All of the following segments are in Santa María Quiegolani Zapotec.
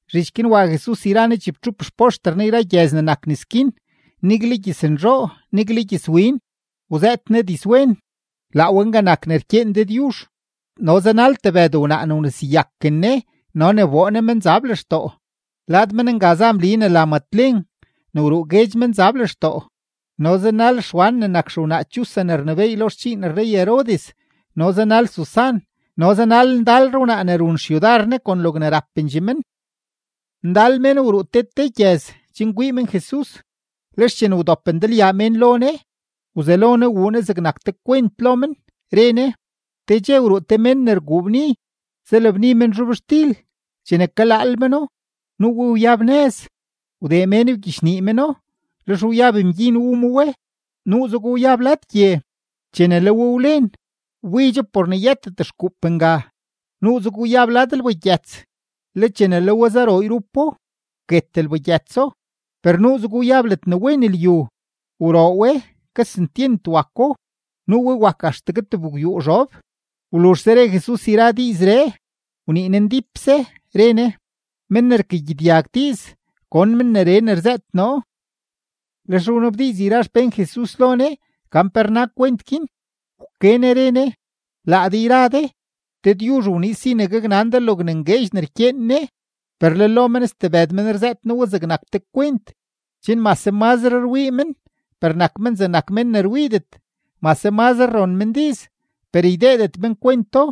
Zhich guin wa Jesus yra Ne chibtxup xpoxter Ne yra gyëz ne nak nes guin, nigle gyëznzhoo, nigle gyëzwin; wzëët Ne dizwen, laa we nga nak ne rkyeen Dëdyuzh. No zanal tebëd wnaa ne wneseyaken Ne no ne wboo Ne menzab lextoo. Lad men nga za Mli ne la Matlen ne wruu guedx menzab lextoo, no zanal Xwan ne nak xewnaa Chuza ne rnebééy lo xdxiin rrey-Herodes, no zanal Susan, no zanal ndalre wnaa ne run xyudar Ne kon logne rapendxee men. Ndal mén wruu te te gyëz chen kwii men Jesus. Lex chene wdop ndalyaa mén lo Ne, wzelo Ne wuu Ne zegnak te kwent lo men, re Ne: ―Te dxe wruu te mén ne rguu bni, zalabni men zhobxtil. Chene kalaal meno, nuu we wyab nëz, wdee mén wgyichnii meno; lex wyab mgyin wu ma we. Nuuzego wyab lad gye; chene le we wlen, wbidxo por ne yëtet xkuup nga. Nuuzego wyab lad lbagyëts; le chene le we zaroo yrupo, wket lbagyëtso. Per nuuzego wyab ledne wen lyu. Wroo we, kesentyent wako, nuu we wak axtegue tebgwyuu zhob. Wluzhse re Jesus yra diizree, wnii Ne ndípse, re Ne: ―Men ne rkagyedyag diiz, gon men neree ne rzëët noo. Lex wnabdiiz yra xpén Jesus lo Ne gan pe rna kwent guin. Wke Ne re Ne: ―Laa de yra de, Dëdyuzh wniiz si ne gaknan de logne ngueedx ne rkyeen Ne, per le lo men stebëd men rzëët noo we zegnak te kwent, chen mase mazre rwii men, per nak men zegnak mén ne rwiidet; mase mazre ron men diiz, per ydeedet men kwento.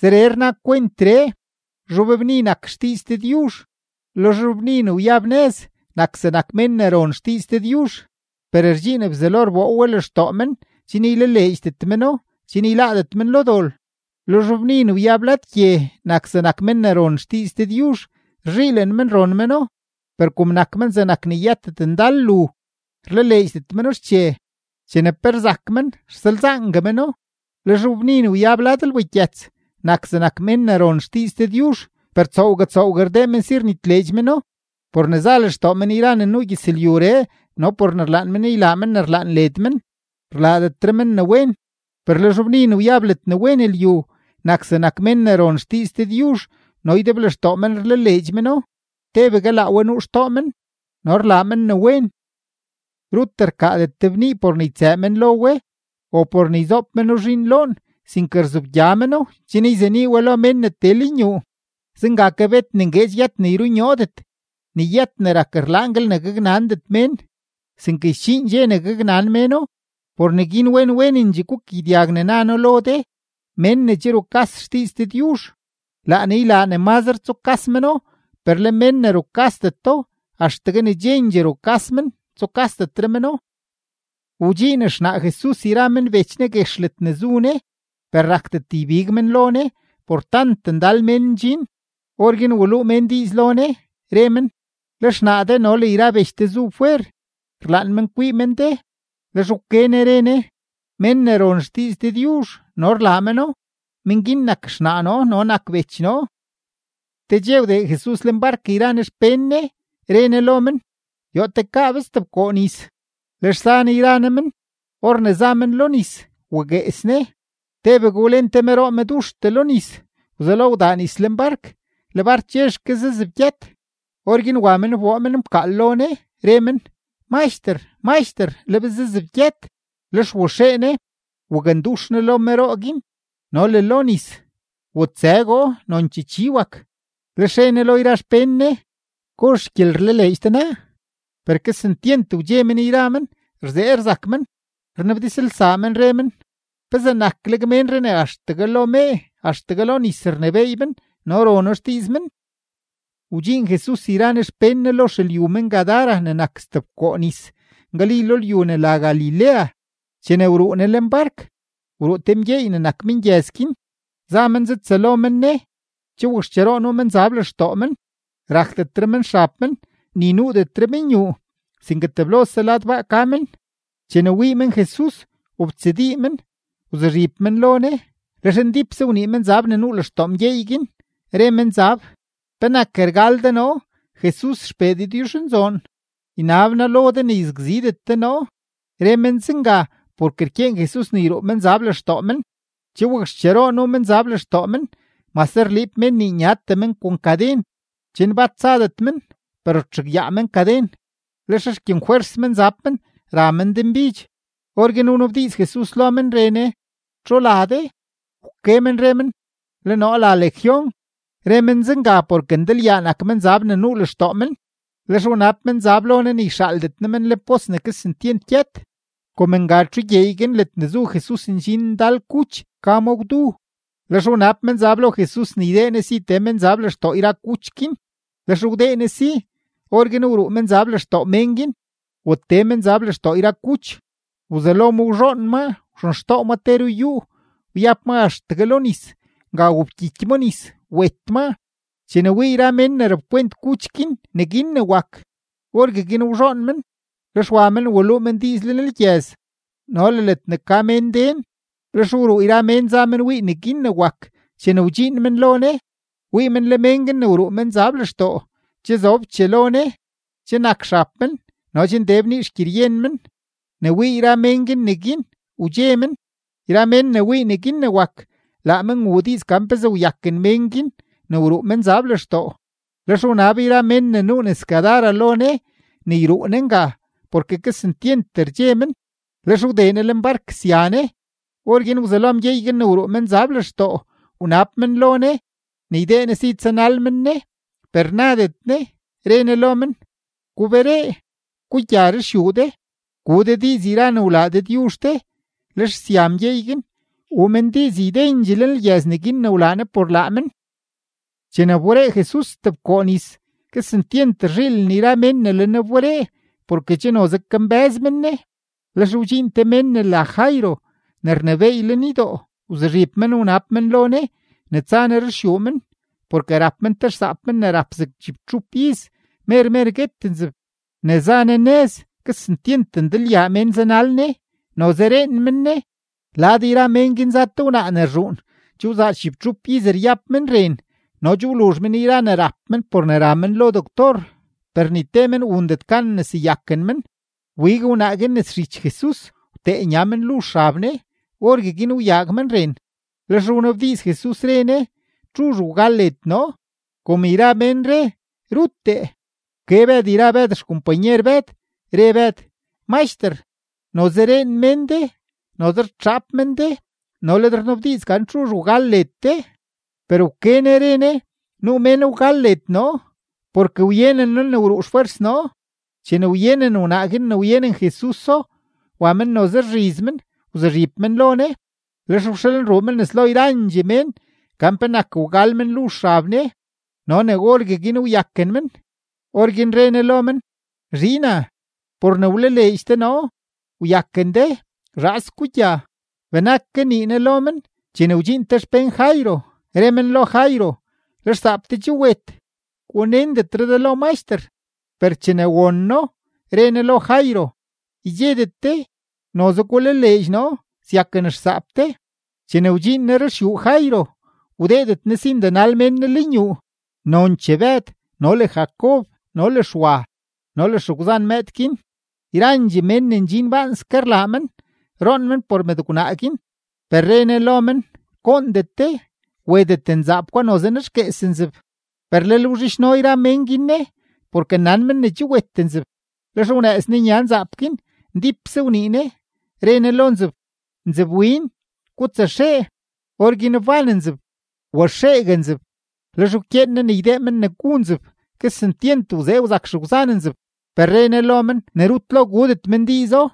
’Zeree rna kwentree: Zhobbni nak xdiiz Dëdyuzh. Le zhobbni ne wyab nëz nak zegnak mén ne ron xdiiz Dëdyuzh, per rdxiin Bzelo rboo we lextoo men chen ylaleedxdet meno chen yláádet men lo dol. Le zhobbni ne wyab lad gye nak zegnak mén ne ron xdiiz Dëdyuzh; rzhiilen men ron meno, per kom nak men zegnak ne yëtet ndal lu, rlaleedxdet meno xche; chene pe rzak men, rsalzaangue meno. Le zhobbni ne wyab lad lbagyëts nak zegnak mén ne ron xdiiz Dëdyuzh, per tsoowgue tsoowgue rdee men si rnitleedx meno, por ne za lextoo men yra ne nuu gyëzlyuree no por ne rlaan men ne ylaa men ne rlaan led men, rlaadetre men ne wen. Per le zhobbni ne wyab ledne wen lyu, nak zegnak mén ne ron xdiiz Dëdyuzh no ydeblextoo men rlaleedx meno, tebegue laa we nuu xtoo men, no rlaa men ne wen. ’Rut rkaadet te bnii por ne ytsëë men lo we o por ne yzoob meno zhiin loon, sinke rzobgya meno chen yzenii we lo mén ne tee lenyuu. Zenga ke, bet ne ngueedx yët ne yrunyoodet, ni yët ne rak rlaanguel ne gaknandet mén, sinke sdxiin dxe ne gaknan méno. ’Por neguin wen wenendxee gukagyedyag ne na noo lo de. Men ne che rukas xdiiz Dëdyuzh, laa Ne ylaa ne mazre tsukas meno; per le men ne rukasdeto, axtegue ne chendxee rukas men, tsukasdetre meno. Wdxiin xnaa Jesus yra men bech Ne guex ledne zu Ne, per rakdet ybig men lo Ne por tant ndal mén ndxin. Orguin waluu mén diiz lo Ne, re men: ―Le xnaa de no le yra bech de zu fwer, rlaan men kwii men de. Lex wke Ne re Ne: ―Men ne ron xdiiz Dëdyuzh no rlaa meno, men guin nak xnaa noo no nak bech noo. Te dxe wdee Jesus lenbark yra Ne xpén Ne, re Ne lo men: ―Yoo tekaa be stebkoo nis. Lex za Ne yra Ne men. Or ne za men lo nis, waguees Ne. Tebegue wlen te meroo meduxtee lo nis; wzelo wdaa nis lenbark, le bark chexke zazebgyët. Orguin wa men wboo men mkaal lo Ne, re men: ―¡Maxter! ¡Maxter! ¡Le be zazebgyët! Lex waxee Ne wakndux Ne lo meroo guin no le lo nis; wutsëgoo, nonchee chi wak. Lex re Ne lo yra xpén Ne: ―¿Gozh xgyelerlaleedx de naa? Per kesentyent wdxe men yra men, rzee rzak men, rnabdizlsaa men, re men: ―¿Pezee nakleg ménree ne axtegue lo mee, axtegue lo nis rnebééy men, no rono xdiiz men? Wdxiin Jesus yra Ne xpén Ne lo xelyu men-Gadara ne nak stebkoo nis, ngali lyu ne la Galilea. Chene wruu Ne lenbark, wruu te mgyeey ne nak mengyëz guin, za men zatsëlo men Ne. Che wakxcheroo nuu menzab lextoo men. Rakdetre men xab men, ni nuudetre men yuu, sinke teblose lad baa ka men. Chene wii men Jesus, wobtsadii men, wzuzhib men lo Ne, lex ndípse wnii menzab ne nuu lextoo mgyeey guin, re menzab: ―¿Penak rgal de noo, Jesus XPee Dëdyuzhnzoon? Ynab noo lo de ne yzakzidet de noo. Re men zenga porke rkyeen Jesus ne yruu menzab lextoo men. Che wakxcheroo nuu menzab lextoo men; mase rliib mén nii nyatee men kon kaden chen bat tsadet men, per rtxugyaa men kaden; lex rkyenfwers menzab men ra men denbidx. Orguin wnabdiiz Jesus lo men, re Ne: ―¿Txu la de? Wke men re men: ―Le noo la Legión. Re men zenga porke ndalyaa nak menzab ne nuu lextoo men. Lex wnab menzab lo Ne ne yxaaldet Ne men lenpos ne kesentyent gyët. Kom nga txu gyeey guin ledne zu Jesus ndxin ndal kuch ka ma gwdu, lex wnab menzab lo Jesus ne ydee Ne si tee menzab lextoo yra kuch guin, lex wdee Ne si. Orguin wruu menzab lextoo mén guin, watee menzab lextoo yra kuch. Wzelo ma wzhoon maa wxenxtoo ma te ruyúú, wyab ma axtegue lo nis. Nga wobkyiky ma nis, wet maa. Chene wii yra mén ne rapkwent kuch guin neguin ne wak, orgueguin wzhoon men, lex wa men waluu men diiz lenlgyëz no le ledne ka mén den. Lex wruu yra mén za men wii neguin ne wak. Chene wdxiin men lo Ne, wii men le mén guin ne wruu menzab lextoo che zobchee lo Ne, che nak men xab men no che nde bnii xgyeryen men. Ne wii yra mén guin neguin, wdxe men. Yra mén ne wii neguin ne wak, laa men wuu diiz gan pezee wyaken mén guin ne wruu menzab lextoo. Lex wnab yra mén ne nuu nes Gadara lo Ne ne yruu Ne nga, porke kesentyent rdxe men. Lex wdee Ne lenbark sya Ne. Orguin wzelo mgyeey guin ne wruu menzab lextoo wnab men lo Ne ne ydee Ne si tsanal men Ne, per nadet Ne, re Ne lo men: ―Guberee, gugya ruxyuu de, gu de diiz yra ne wlaa Dëdyuzh de. Lex sya mgyeey guin, wuu men diiz ydendxee lenlgyëz neguin ne wlaa Jesus por laa men. Chene wberee Jesus stebkoo nis, kesentyent rzhiilen yra mén ne le Ne wberee porke che noze kambë́z men Ne. Lex wdxiin te mén ne la Jairo ne rnebééy lenydoo, wzuzhib men wnab men lo Ne ne tsa Ne ruxyuu men, porke rap men te xsaap men ne rap zeg chibtxup iz, mer mer guet nzeb. Ne za Ne nëz, kesentyent ndalyaa mén zanal Ne, noze reen men Ne. Lad yra mén guin za te wnaa ne rzhuun, che wzaa chibtxup iz ryab men ren, no che wluzh men yra ne rap men por ne ra men lo doctor; per ni te men wundet gan nneseyaken men. Wbig wnaa guin nes zhich Jesus, wtee nya men luzh xab Ne. Orgueguin wyaag men ren. Lex wnabdiiz Jesus, re Ne: ―¿Txuzh wgal led noo? Kom yra mén re: “Ruttee”, wke Bëd yra Bëd xkompanyer Bëd, re Bëd: ―Maxter, noze reen mén de, noze rtxaap men de, no le de rnabdiiz gan txuzh wgal led de. Per wke Ne re Ne: ―Nuu mén wgal led noo, porke wyenen noo ne wruu xfwers noo. Chene wyenen wnaa guin ne wyenen Jesuso, wa men noze rzhiz men, wzuzhib men lo Ne. Lex wxalruu men nes lo yrandxee mén, gan penak wgal men luzh xab Ne no ne orgueguin wyaken men. Orguin re Ne lo men: ―Zhiina, por ne wlaleedx de noo, wyaken de. Zhaas gugya. Benak kanii Ne lo men, chene wdxiin te xpén Jairo, re men lo Jairo: ―Le xsaap de che wet. Gunendetre de lo Maxter. Per chene won No, re Ne lo Jairo: ―Ydxedet de; noze gulaleedx noo, syaken xsaap de. Chene wdxiin Ne ruxyuu Jairo, wdeedet Ne si ndenal ndal mén Ne lenyuu, nonchee Bëd no le Jacob no le Xwa no le xegwzan mëëd guin. Yrandxee mén ne ndxin baanske rlaa men, roon men por mëdgwnaa guin. Per re Ne lo men: ―Goondet de; wetet nzaap gwa, noze nexguees nzeb. Per lel wzhidxno yra mén guin Ne, porke nan men ne che wet nzeb. Lex wnëëz Ne nya nzaap guin, ndípse wnii Ne, re Ne lo nzeb: ―Nzebwin, gutsaxee. Orguin wban nzeb, waxeegue nzeb; lex wkyeen Ne ne ydee men ne gu nzeb. Kesentyent wzee wzak xegwzan nzeb, per re Ne lo men ne rut lo gudet men diizo.